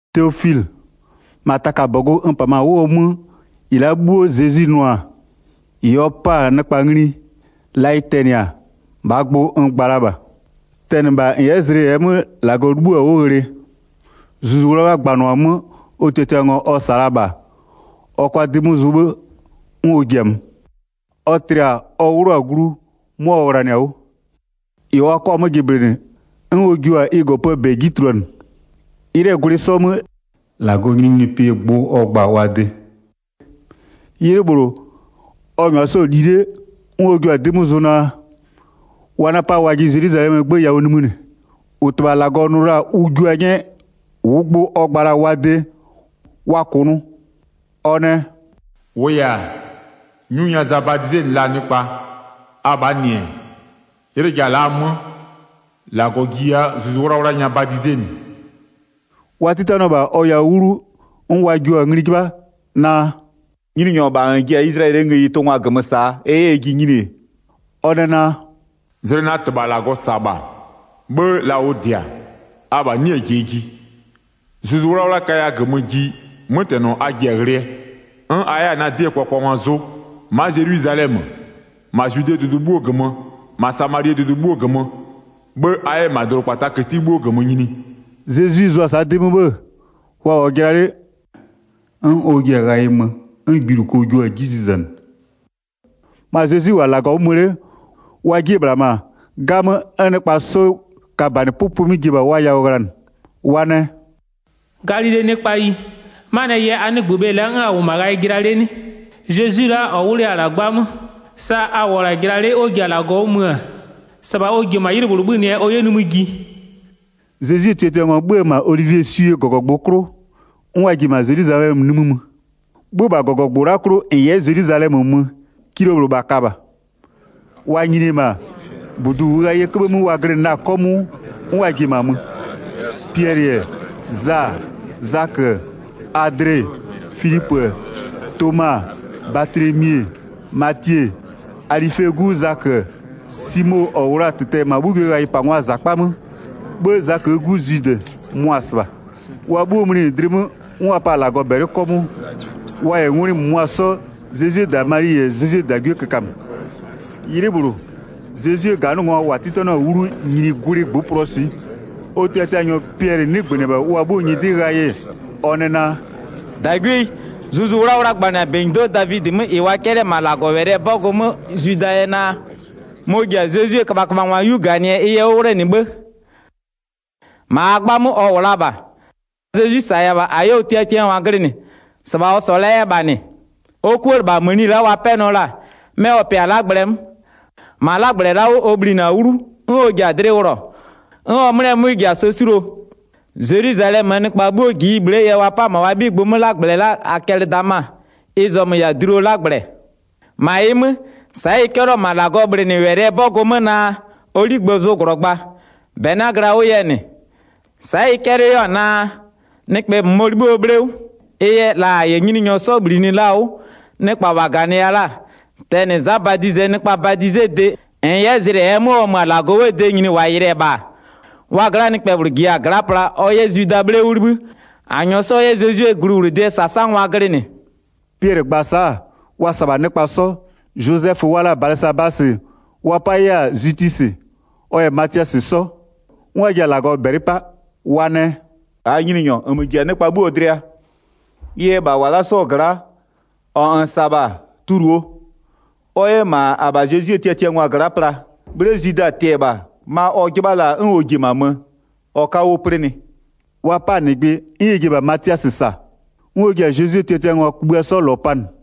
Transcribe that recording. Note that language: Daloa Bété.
Teofilɩ, -ma taka -bɔgʋ n -pamö-a 'wʋɔ 'mö, -ɩ la'a 'bhuo Zezwi nʋ-a, -ɩ ɔ 'pa-a nɩkpa ngli, la ɩ tɛnɩ-a, -bhaa gbʋ n gba la -bha. Tɛnɩ -bha -n 'yɛ zlɩ -ɛɛ 'mö -Lagɔ 'libhïɔ-a 'wʋ ghlɩ, Zuzu 'Wlawla gbanɩɔ-a 'mö ɔ tiatiangwa ɔ -sa la-a -bha, ɔ kʋa 'dɩ 'mö zʋ 'bhë 'n ɔ ji-a mö. Ɔ tlɩ-a ɔ 'wlʋ-a glu, 'mʋa ɔ ghlanɩ-a 'wʋ. -Ɩ wa 'kɔ-a 'mö jɩblɩnɩ, 'n ɔ jua-a ɩ -gɔpöö -bɛ 'ji tuluanɩ. 'Ylɩɛ gwlɩ 'sɔ 'mö, -Lagɔɔ nyininyinipɩɛ gbʋ ɔ gba-a wa de. 'Ylɩ -bhlʋ, ɔ -nyʋa 'sɔ-ɔ li 'le, 'n ɔ jua-a 'dɩ 'mö zʋ naa, wa 'na-a 'pa wajɩ Zelwizalɛmöö 'gbë yawʋ nimï -nɩ, -ʋ -Tɩbha -Lagɔ nʋ la-a ʋ jua 'nyɛɛ -ʋʋ gbʋ ɔ gba la-a wa de, wa -kʋnʋʋ. Ɔ nɛ: “-Wʋʋ yɛ-a, 'nyu nya Za badizenɩ la-a nɩkpa, abhaa -nɩ-ɛ, 'ylɩ ja la'a 'mö, -Lagɔ jiya Zuzu 'Wlawla nya badizenɩ.” Wa 'titanɩɔ -bha ɔ yawʋ 'wlu 'n wa jio-a ngli 'jɩbha naa: “Nyininyɔ, -bha -n ji-a Izlayɛlɩɛ ngëyi tʋngwa -gömö -saa, ɛ 'yɛ ɛjɩ nyini-e?” Ɔ nɛ naa: “Zlɩ na -Tɩbha -Lagɔ -sa-a -bha, 'bhë la ʋ -dɩ-a, abha 'nɩɩ-ɩ -jie ji. Zuzu 'Wlawla kaya -gömö ji, 'mötɛnɔ a ji-a ghlɩɛ, a 'yɛ-a na 'dɩɛ -sasangwa zʋ, ma'a Zelwizalɛmö, -ma Zwidee dʋdʋ 'bhuo -gömö, -ma Samalie dʋdʋ 'bhuo -gömö, 'bhë a 'yɛ -ma dʋdʋkpataa këti 'bhuoo -gömö nyini.” Zezwi zʋʋa-a sa'a 'dɩ 'mö 'bhë, wa -wʋ-ɔ jɩla 'le, 'n ɔ ji-a ghayɩ mö, 'n gbiluko jua-a 'ji zizanɩ. Ma Zezwi -wʋ-a -Lagɔ 'wʋ mö 'le, wa 'jie-e -bhla -ma, 'gamö, 'n nɩkpa sɔ-ɔ ka-a -banɩ 'pʋpʋɩ 'mö ji-e -bha wa yawʋ ghlanɩ. Wa nɛ: “Galilee nɩkpayi, 'manɩɛ yɛ a 'nɩgbö bhe la'a 'n a -wʋ-ɔ -ma ghayɩ jɩla 'le 'nɩ? Zezwi la'a -ɔ 'wlʋya-a -la 'gbamö, sa a -wʋɔ-ɔ -la jɩla 'le 'n ɔ ji-a -Lagɔ 'wʋ mö-ö, -sɩbha ɔ ji-e -ma 'ylɩ -bhlʋ 'bhönɩɛ ɔ 'yɛ nimï ji.” Zezwie tiatiangwa 'bhö-ö -ma Olivieswie -gɔgɔgbʋ 'klʋ, 'n wa ji-e -ma Zelwizalɛmö nimï mö. 'Bhö-ö -bha -gɔgɔgbʋ la'a 'klʋ -n 'yɛ Zelwizalɛmö mö, kilo -bhlʋ -bha ka -bha. Wa nyini-e -ma, -budu -ʋʋ ghayɩɛ 'köbhë 'mö wa glɩnɩ la-a 'kɔmʋʋ, 'n wa ji-e -ma mö. Piɛlɩ-ɛ, Za-a, Zakö-ö, Adle-e, Filipö-ö, Toma-a, Batlemi-e, Matie-e, Alɩfee 'gu Zakö-ö, Simo -ɔ -wʋ la-a -tɩtɛ-ɛ -ma 'bhugwiee ghayɩpangwaa -zakpa 'mö, 'bhë Zaköö 'gu Zwidɩ, mʋa-a -sɩbha. Wa 'bhuo mlinɩ dlɩ 'mö, 'n wa pa-a -Lagɔ -bɛlɩ 'kɔmʋʋ, wa -yɛ ngwlɩ -mʋmʋa 'sɔ, Zezwie -da Mali -yɛ Zezwie -dagwie kökamö. 'Ylɩ -bhlʋ, Zezwie -ganɩngwa -wa 'titanɩɔ-a 'wlu nyini gwlɩ -ngbʋpʋlʋɔ swɩ. Ɔ tiatianyɔ Piɛlɩ 'nɩgbönɩ-ɛ -bha wa 'bhuoo nyɩdɩ ghayɩ ɔ nɛ naa: “-Dagwieyi, Zuzu 'Wlawla gbanɩ-a -benyido'o Davidɩ 'mö -ɩ wa 'cɛlɩ-ɛ -ma -Lagɔwɛlɩɛ 'bɔgʋ 'mö Zwidaa yɛ naa: Mɔ-ɔ ji-a Zezwie köbhaköbhangwa 'yu -ganɩɛ ɩ yɛ 'wʋ 'wlenɩ 'bhë. 17-Ma -aa 'gbamö ɔ -wʋ la -bha, sa Zezwi -saya-a -bha -a 'yɛ ɔ tiatiangwa glɩnɩ, -sɩbha ɔ -sɔɔ la 'yɛ-ɛ -bha -nɩ. Ɔ 'kuëlɩbhamëni la'a wa 'pɛnɩɔ la-a, 'mɛ ɔ pɩa-a 'lagblɛ 'mö. -Ma 'lagblɛ la'a 'wʋ ɔ bhlinɩ-a 'wlu 'n ɔ ji-a dlɩ wʋlɔ, 'n ɔ 'mlɩɛ 'mwɩ ji-a sɛ 'suluo. Zelwizalɛmöö nɩkpa 'bhuo -ji ɩ bhle'ee yɛ wa 'pa-a -ma wa 'bhigbʋ 'mö 'lagblɛ la'a Akɛlɩdama, ɩ zɔmö -yɛ-a dluo 'lagblɛ. 20-Ma ɩ 'mö, sa'a ɩ 'cɛlɩɔ-ɔ -ma -Lagɔɔ bhlɩnɩlʋɩɛ 'bɔgʋ 'mö naa: Ɔ 'ligbë zʋ -glɔgba, -bɛ 'na-a glɩa 'wʋ yɛ -nɩ. Sa'a ɩ 'cɛlɩɔ 'yɛ-a naa: Nɩkpɛ -mʋmɔ 'libhï ɔ 'bhle 'wʋ. Ɩ yɛ, la -a -yɛ Nyininyɔ Zezwi 'sɔ -bhlinɩ la-a 'wʋ, nɩkpa -wa -ganɩya la-a, tɛnɩ Za Badizɩɛ nɩkpaa badizede -n 'yɛ zlɩ -ɛɛ 'mö ɔ mö-a -Lagɔ 'wʋɔ de nyini -wa yɩlɩ-ɛ -bha-a, wa gla'aa nɩkpɛ -bhlʋ -jiya-a gla'a pla ɔ 'yɛ Zwidaa 'bhle 'wʋ 'libhï -a -nyɔɔ 'sɔ 'yɛ Zezwie gluwlʋdɩɛ -sasangwa glɩnɩ.” Piɛlɩ gba-a sa'a, wa -sa-a -bha nɩkpa 'sɔ. Zozɛfö wa la-a Balɩsabasɩ, wa 'pa 'yɛ-a Zwitisɩ, ɔ -yɛ Matiasɩ 'sɔ. 'N wa ji-a -Lagɔ -bɛlɩ 'pa, wa nɛ: “-Aa Nyininyɔ, -nmö -ji-a nɩkpa 'bhuoo dlɩa, ɩ yɛ -bha -wa la'a 'sɔɔ gla'a -ɔ -n -sa-a -bha, tuluo ɔ 'yɛ -ma -abha Zezwie tiatiangwa gla'a pla, 'bhle Zwida tɩ-ɛ -bha, ma ɔ 'jɩbha la-a 'n ɔ ji-e -ma mö, ɔ 'ka 'wʋ 'plɩnɩ.” Wa 'pa-a -nɩgbɩ 'n ɛ ji-e -bha Matiasɩ -sa, 'n ɔ ji-a Zezwie tiatiangwa kugbïa 'sɔ -lɔ panɩ.